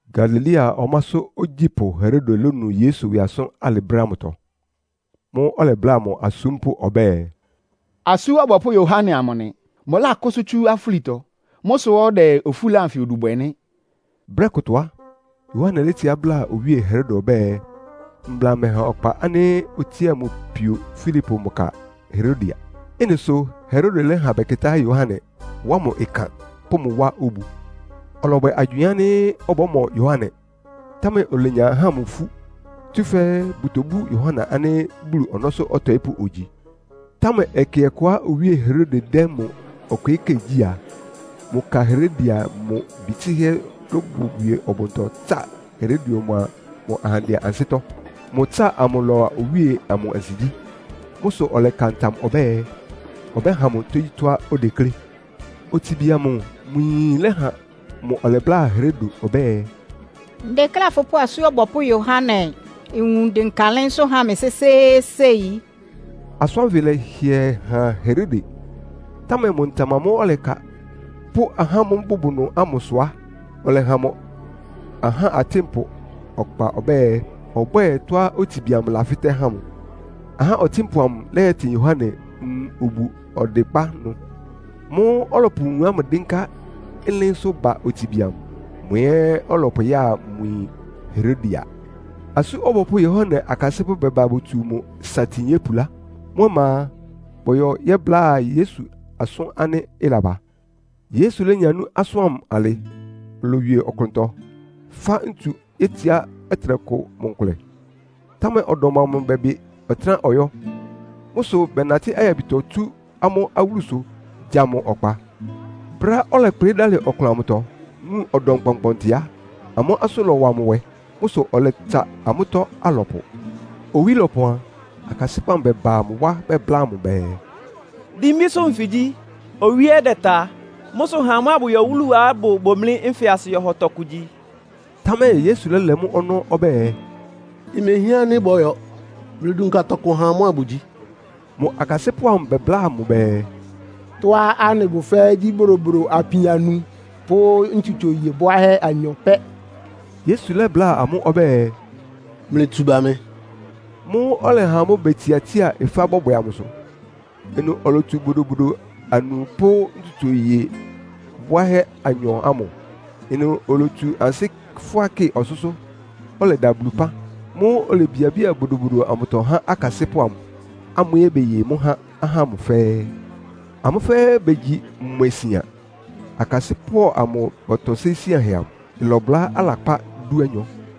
Galilea ɔmásʋ́ ogyípʋ́ Herode lónu Yesu ɩwɩ asʋ́n alɩ brɛ́ ámʋtɔ. Mʋ́ʋ́ ɔlɛbláa mʋ asúmpʋ́ ɔbɛ́ɛ, “Asú Ɔbɔpʋ́ Yohane amʋ nɩ. Mʋlákʋ́sʋ́ tsú afúlitɔ. Mʋ́ sʋ́ ɔdɛ ofúla anfɩ odu bwɛ nɩ́.” Brɛ́ kʋtɔ á, Yohane létsiá bláa Owíe Herode ɔbɛ́ɛ, mbla mɛha ɔkpa ánɩ́ otsía mʋ pio Filipo mʋ ka Herodia. Ɩ́nɩ sʋ Herode lɛ́ha bɛkɩtá Yohane, wá mʋ ɩkan, pʋ́ mʋ wá obu. Ɔlɔbwɛ agywɩɩn ánɩ́ ɔbɔ́mɔ Yohane, támɛ olenya ahá ámʋ ifú, tsúfɛ́ bʋtobú Yohane ánɩ́ Bulu ɔnɔ́sʋ́ ɔtɔɩ́pʋ́ ogyi. Támɛ ɛkɛ ɔkʋá Owíe Herode dɛ́ mʋ ɔkwɩɩ́kɛ́ gyí a, mʋ ka Herodia mʋ bi tsɩ́hɛ́ lóbowie ɔbʋntɔ tsa Herode mʋa mʋ ahandɛ ansɩ́tɔ́. Mʋ ɩtsáa amʋ lɔ́wa owíe amʋ ansigyí. Mʋ́ sʋ ɔlɛka ntam ɔbɛ́ɛ, ɔbɛ́ha mʋ tógyítɔ́á odeklé. Otsibi amʋ mʋ yin lɛ́ha mʋ ɔlɛbláa Herode ɔbɛ́ɛ, “Ndekléá fʋpʋ́ Asú Ɔbɔpʋ́ Yohane nwun dɩnka ɩlɩ́nsʋ́ ha mɩ sésééséi.” Asʋ́n ánfɩ lɛ́hɩɛ han Herode, támɛ mʋ ntam amʋ́ʋ́ ɔlɛka, pʋ́ ahá ámʋ́ʋ́ bʋbʋ ɩnʋ ámʋ sʋ á, ɔlɛha mʋ ahá ɔtɩ́npʋ ɔkpa ɔbɛ́ɛ, ɔbwɛ́ɛ tɔ́á otsibi amʋ lafɩ́tɛ́ ha mʋ. Ahá ɔtɩ́npʋ amʋ lɛ́yɛtɩn Yohane nwun obu ɔdɩkpá ɩnʋ. Mʋ́ʋ́ ɔlɔpʋ nwun ámʋ dɩ́nká ɩlɩ́nsʋ́ ba otsibi amʋ, mʋ ɛ́ ɔlɔpʋya mʋ yin Herodia. Asú Ɔbɔpʋ́ Yohane akasɩ́pʋ́ bɛba botsu mʋ satin yópulá. Mʋ́ ɔma a, bɔyɔ yɛ́bláa Yesu asʋ́n ánɩ́ ɩlaba. Yesu lénya nú asʋ́n ámʋ alɩ, olowie ɔklʋntɔ, fá ntsu yétsiá ɔtɩnɛkʋ mʋ nkʋlɛ. Támɛ ɔdɔm ámʋ bɛbɩ ɔtɩ́nɛ́á ɔyɔ́. Mʋ́ sʋ bɛnatɩ́ ayabitɔ tsú amʋ́ awúlusʋ gya mʋ nkpá. Brɛ́á ɔlɛkplɩ́ dalɩ ɔklʋn amʋtɔ, wun ɔdɔm kpɔnkpɔɔnkpɔntɩ á, amʋ́ asʋ́n lɔwa mʋ nwɛ. Mʋ́ sʋ ɔlɛtsa amʋ́tɔ́ alɔpʋ. Owí lɔpɔn a, akasɩ́pʋ́ amʋ bɛba mʋ wá bɛbláa mʋ bɛɛ, “Dimbísʋ́ nfɩ gyí, owí ɛ́ dɛta. Mʋ́ sʋ ha amʋ́ abʋyɔ awúluá ɩbʋ bomlí nfɩ asɩ yɔhɔ tɔkʋ gyi.” Támɛ Yesu lɛ́lɛ mʋ́ ɔnɔ́ ɔbɛ́ɛ, “Imehián ánɩ́ bɔ́yɔ. Mlɩdunka tɔkʋ ha amʋ́ abʋgyi.” Mʋ akasɩ́pʋ́ amʋ bɛbláa mʋ bɛɛ, “Tɔ́á anɩbʋ fɛ́ɛ́ gyí bodobodo apin anu pʋ́ ntsutso iye bwáhɛ́ anyɔ pɛ́.” Yesu lɛ́bláa amʋ́ ɔbɛ́ɛ, “Mlɩtsu ba mɩ.” Mʋ́ʋ́ ɔlɛha ahá ámʋ betsiatsía ɩfa bɔbwɛ amʋsʋ. Ɩnʋ olotsu bodobodo anu pʋ́ ntsutso iye bwáhɛ́ anyɔ ámʋ. Ɩnʋ olotsu ansɩ́ fʋ́á kɩ ɔsʋ́sʋ́, ɔlɛda Bulu ɩpán. Mʋ́ʋ́ olebiabía bodobodo amʋtɔ há akasɩ́pʋ́ amʋ, amʋ́ ɛ́ beye mʋ́ ha ahá ámʋ fɛ́ɛ́. Amʋ́ fɛ́ɛ́ begyi mwɛ sian. Akasɩ́pʋ́ amʋ bɔtɔsɩ́ síanhɛ amʋ. Ɩlɔbʋlá alakpá dúanyɔ.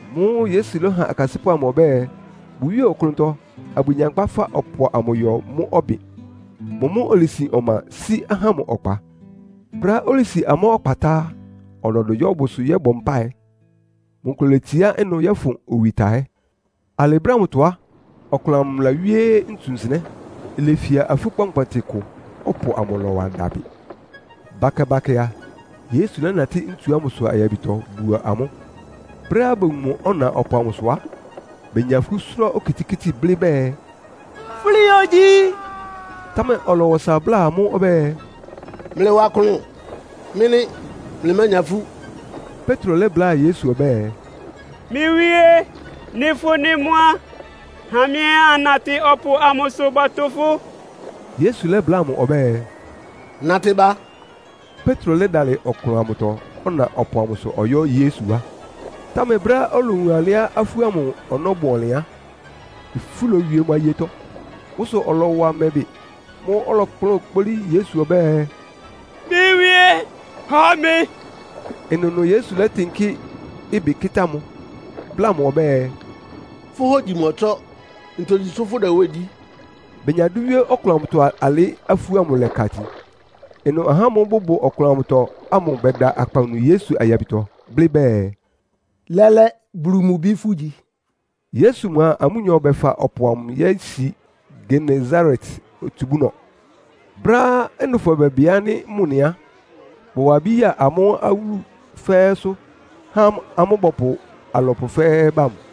Mʋ́ʋ́ Yesu lɛ́ha akasɩ́pʋ́ amʋ ɔbɛ́ɛ, bʋwíe ɔklʋntɔ, abʋgyankpa fa ɔpʋ amʋ yɔ mʋ́ ɔbɩn. Mʋ mʋ́ olesin ɔma sí ahá ámʋ ɔkpa. Brɛ́á olesi amʋ́ ɔkpa tá á, ɔlɔdʋ yɔ́ bʋsʋ yɔ́bɔ mpáɩ. Mʋ nkʋlɛ oletsiá ɩnʋ yɔ́fʋn owi tahɛ́. Alɩ brɛ́ ámʋtɔ á, ɔklʋn amʋ lawíé ntsu nsɩnɛ́. Ilefia afú kpɔnkpɔntɩ kʋ, ɔpʋ amʋ lɔ́wa dabɩ. Bakɛ-bakɛ a, Yesu lɛ́natɩ́ ntsu ámʋsʋ ayabitɔ buo amʋ́. Brɛ́á bowun mʋ, ɔna ɔpʋ amʋsʋ á, benya ifú sʋ́rá okitikíti, blɩ́ bɛɛ, “Fúli ogyi.” Támɛ ɔlɔwa ɔsa bláa amʋ́ ɔbɛ́ɛ, “Mlɩwa klʋn. Mɩ́ nɩ́. Mlɩmánya ifú.” Petro lɛ́bláa Yesu ɔbɛ́ɛ, “Mɩ́ Wíé, nɩ́ fʋ́ nɩ́ mʋ́ á, ha mɩ́ ɛ́ annatɩ ɔpʋ amʋsʋ bɔtʋ fʋ́.” Yesu lɛ́bláa mʋ ɔbɛ́ɛ, “Natɩ ba.” Petro lɛ́dalɩ ɔklʋn amʋtɔ ɔna ɔpʋ amʋsʋ ɔyɔ́ Yesu wá. Támɛ brɛ́á olowun alɩá afú ámʋ ɔnɔ́ bʋ ɔnlɩn á, ifú lowie mʋ ayetɔ. Mʋ́ sʋ ɔlɔwa mɛ bɩ. Mʋ́ʋ́ ɔlɔkplʋ́n kpolí Yesu ɔbɛ́ɛ, “Mɩ́ Wíé, hɔ mɩ!” Ɩnʋnʋ Yesu lɛ́tɩnkɩ́ ɩbɩ kɩ́tá mʋ, bláa mʋ ɔbɛ́ɛ, “Fʋ́ hógyi mɔtsɔ́. Ntogyi sʋ́ fʋ́dɛ nwɛ́ɛn gyí?” Benya dʋ́ wíé ɔklʋn amʋtɔ alɩ, afú ámʋ lɛ́ka itin. Ɩnʋ ahá ámʋ́ʋ́ bʋbʋ ɔklʋn amʋtɔ ámʋ bɛda akpawunu Yesu ayabitɔ, blɩ́ bɛɛ, “Lɛ́lɛ́, Bulu mʋ Bi fʋ́gyi.” Yesu mʋa amʋ́nyɔ bɛfa ɔpʋ amʋ yési Genesaret otsubúnɔ. Brɛ́á ɩnʋfɔ bɛbɩ ánɩ́ mʋ nɩ á, bɔwa abí ya amʋ́ awúlu fɛ́ɛ́sʋ́, há amʋ́ bɔpʋ alɔpʋ fɛ́ɛ́ ba mʋ.